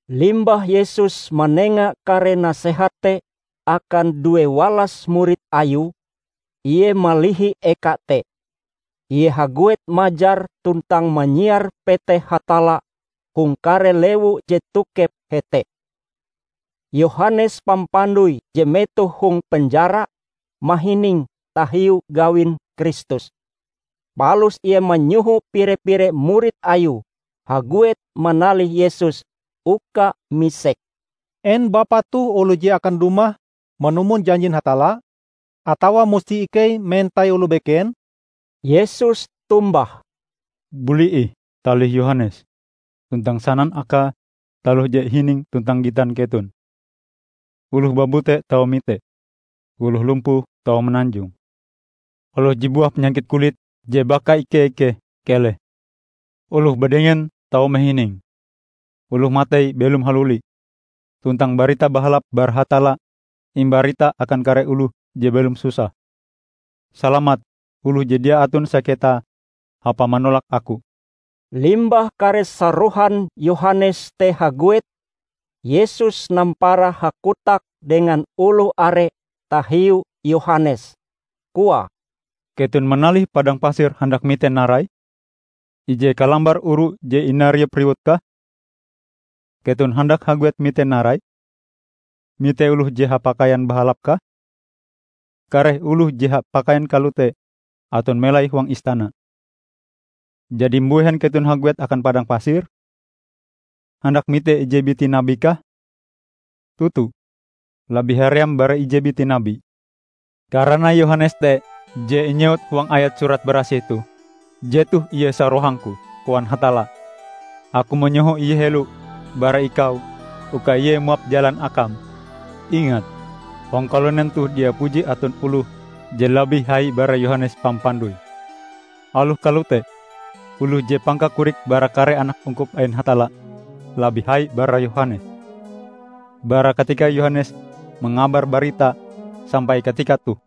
Limbah Yesus manenga kare nasehat te akan due walas murid Ayue, Ie malihi eka te. Ie haguet majar tuntang manyiar peteh Hatalla hong kare lewu je tokep hete. Yohanes Pampandoi je metoh hong penjara, mahining tahiu gawin Kristus. Palus ie manyoho pire-pire murid Ayue haguet manalih Yesus uka misek, "En Bapa toh oloh je akan dumah manumon janjin Hatalla, atawa musti ikei mentai oloh beken?" Yesus tombah, "Buli ih talih Yohanes, tuntang sanan akae taloh je ihining tuntang gitan keton: Oloh babute tau mite, oloh lumpuh tau mananjong, oloh je buah panyakit kulit je bakaike-ikeh keleh; oloh badengen tau mahining, oloh matei belom haluli, tuntang Barita Bahalap bara Hatalla imbarita akan kare oloh je belom susah. Salamat oloh je dia aton saketa hapae manolak Aku!" Limbah kare sarohan Yohanes te haguet Yesus nampara hakotak dengan oloh are tahiu Yohanes, koae, "Keton manalih padang pasir handak mite narai? Ije kalambar oru je inariup riwutkah? Keton handak haguet mite narai? Mite oloh je hapakaian bahalapkah? Kare oloh je hapakaian kalote aton melai huang istana! Jadi mbuhen keton haguet akan padang pasir? Handak mite ije biti nabikah? Toto, labih haream bara ije biti nabi. Karana Yohanes te je inyewut huang ayat Surat Barasih toh, 'Jetoh ie sarohang-Ku, koan Hatalla, Aku manyoho ie helo bara Ikau uka ie muap jalan Akam.' Ingat! hong kalunen toh dia puji aton oloh je labih hai bara Yohanes Pampandoi. Aloh kalote, oloh je pangkakorike bara kare anak ungkup ain Hatalla, labih hai bara Yohanes. Bara katika Yohanes mangabar baritae sampai katika toh,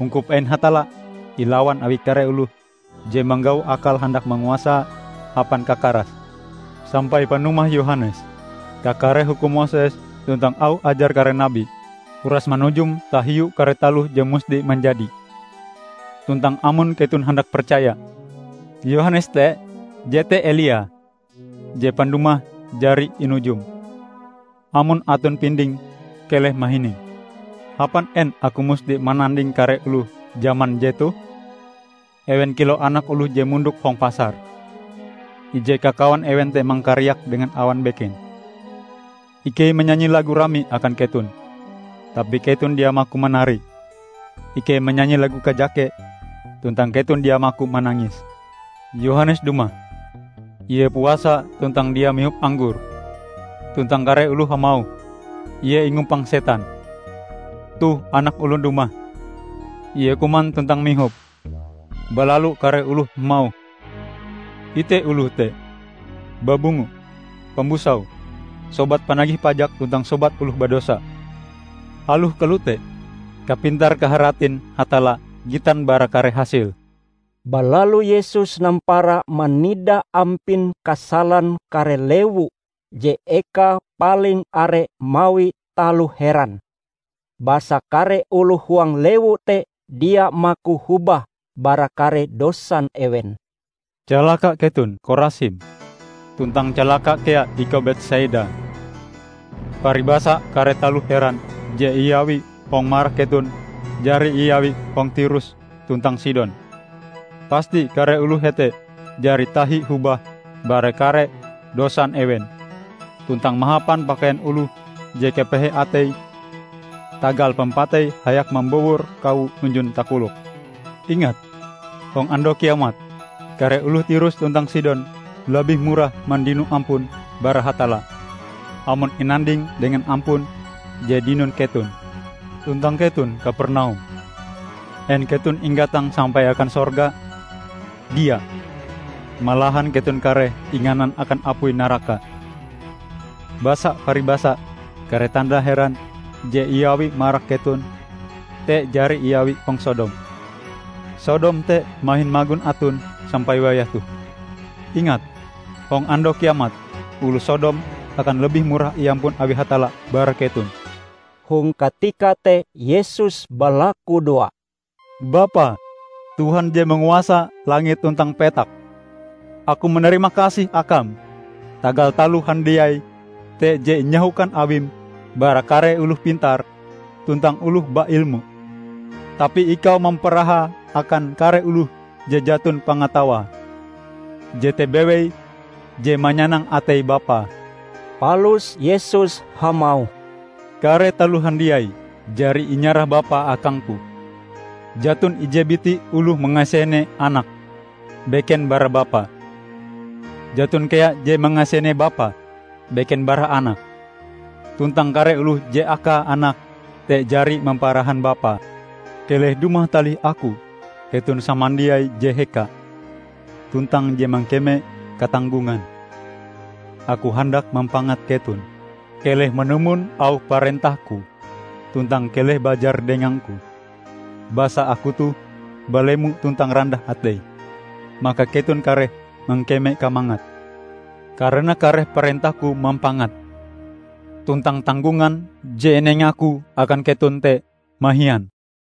ungkup ain Hatalla ilawan awi kare oloh je manggau akal handak manguasae hapan kakarase. Sampai panumah Yohanes, kakare hukum Moses tuntang auh ajar kare nabi, uras manujum tahiu kare taloh je musti manjadi. Tuntang amon keton handak percaya, Yohanes te jete Elia, je pandumahe jari inujum. Amon aton pinding, keleh mahining! Hapan en Aku musti mananding kare oloh jaman jetoh? Ewen kilau anak oloh je mondok hong pasar. Ije kakawan ewen te mangkariak dengan awang beken, 'Ikei manyanyi lagu rami akan keton, tapi keton dia maku manari! Ikei manyanyi lagu kajake, tuntang keton dia maku manangis!' Yohanes dumah -- ie puasa tuntang dia mihop anggor; tuntang kare oloh hamauh, 'Ie ingumpang setan!' Toh Anak Olon dumah -- Ie kuman tuntang mihop; balalu kare oloh hamauh, 'Ite oloh te! Babungo, pambusau, sobat panagih pajak tuntang sobat oloh badosa.' Aloh kalote, kapintar kaharatin Hatalla gitan bara kare hasile." Balalu Yesus nampara manida ampin kasalan kare lewu je ekae paling are mawi taloh heran. Basa kare oloh huang lewu te dia maku hobah bara kare dosan ewen. "Calaka keton, Korasim! Tuntang calaka kea ikau Betsaida! Paribasa kare taloh heran je iawi hong marak keton jari iawi hong Tirus tuntang Sidon, pasti kare oloh hete jari tahi hobah bara kare dosan ewen tuntang mahapan pakaian oloh je kapehe atei tagal pampatei hayak mambowor kawo hunjun takoloke. Ingat, hong Andau Kiamat, kare oloh Tirus tuntang Sidon labih murah mandino ampun bara Hatalla amon inanding dengan ampun je dinon keton! Tuntang keton, Kapernaum! En keton inggatang sampai akan sorga? Dia! Malahan keton kareh inganan akan apui naraka! Basa paribasa kare tanda heran je iawi marak keton te jari iawi hong Sodom, Sodom te mahin magon aton sampai wayah toh! Ingat, hong Andau Kiamat, oloh Sodom akan labih murah iampun awi Hatalla bara keton!" Hong katika te Yesus balakudoa, "Bapa, Tuhan je manguasa langit tuntang petak. Aku manarima kasih Akam tagal taloh handiai te je inyahokan Awim bara kare oloh pintar tuntang oloh bailmu, tapi Ikau mamparahae akan kare oloh je jaton pangatawae. Jete bewei je manyanang atei Bapa." Palus Yesus hamauh, "Kare taloh handiai jari inyarah Bapa akang-Ku. Jaton ije biti oloh mangasene Anak, beken bara Bapa. Jaton kea je mangasene Bapa, beken bara Anak, tuntang kare oloh je akae Anak te jari mamparahan Bapa. Keleh dumah talih Aku keton samandiai je heka, tuntang je mangkeme katanggongan; Aku handak mampangat keton. Keleh manumon auh parentah-Ku tuntang keleh bajar dengang-Ku. Basa Aku toh balemo tuntang randah atei, maka keton kareh mangkeme kamangat. Karana kare parentah-Ku mampangat, tuntang tanggongan je inenga-Ku akan keton te mahian."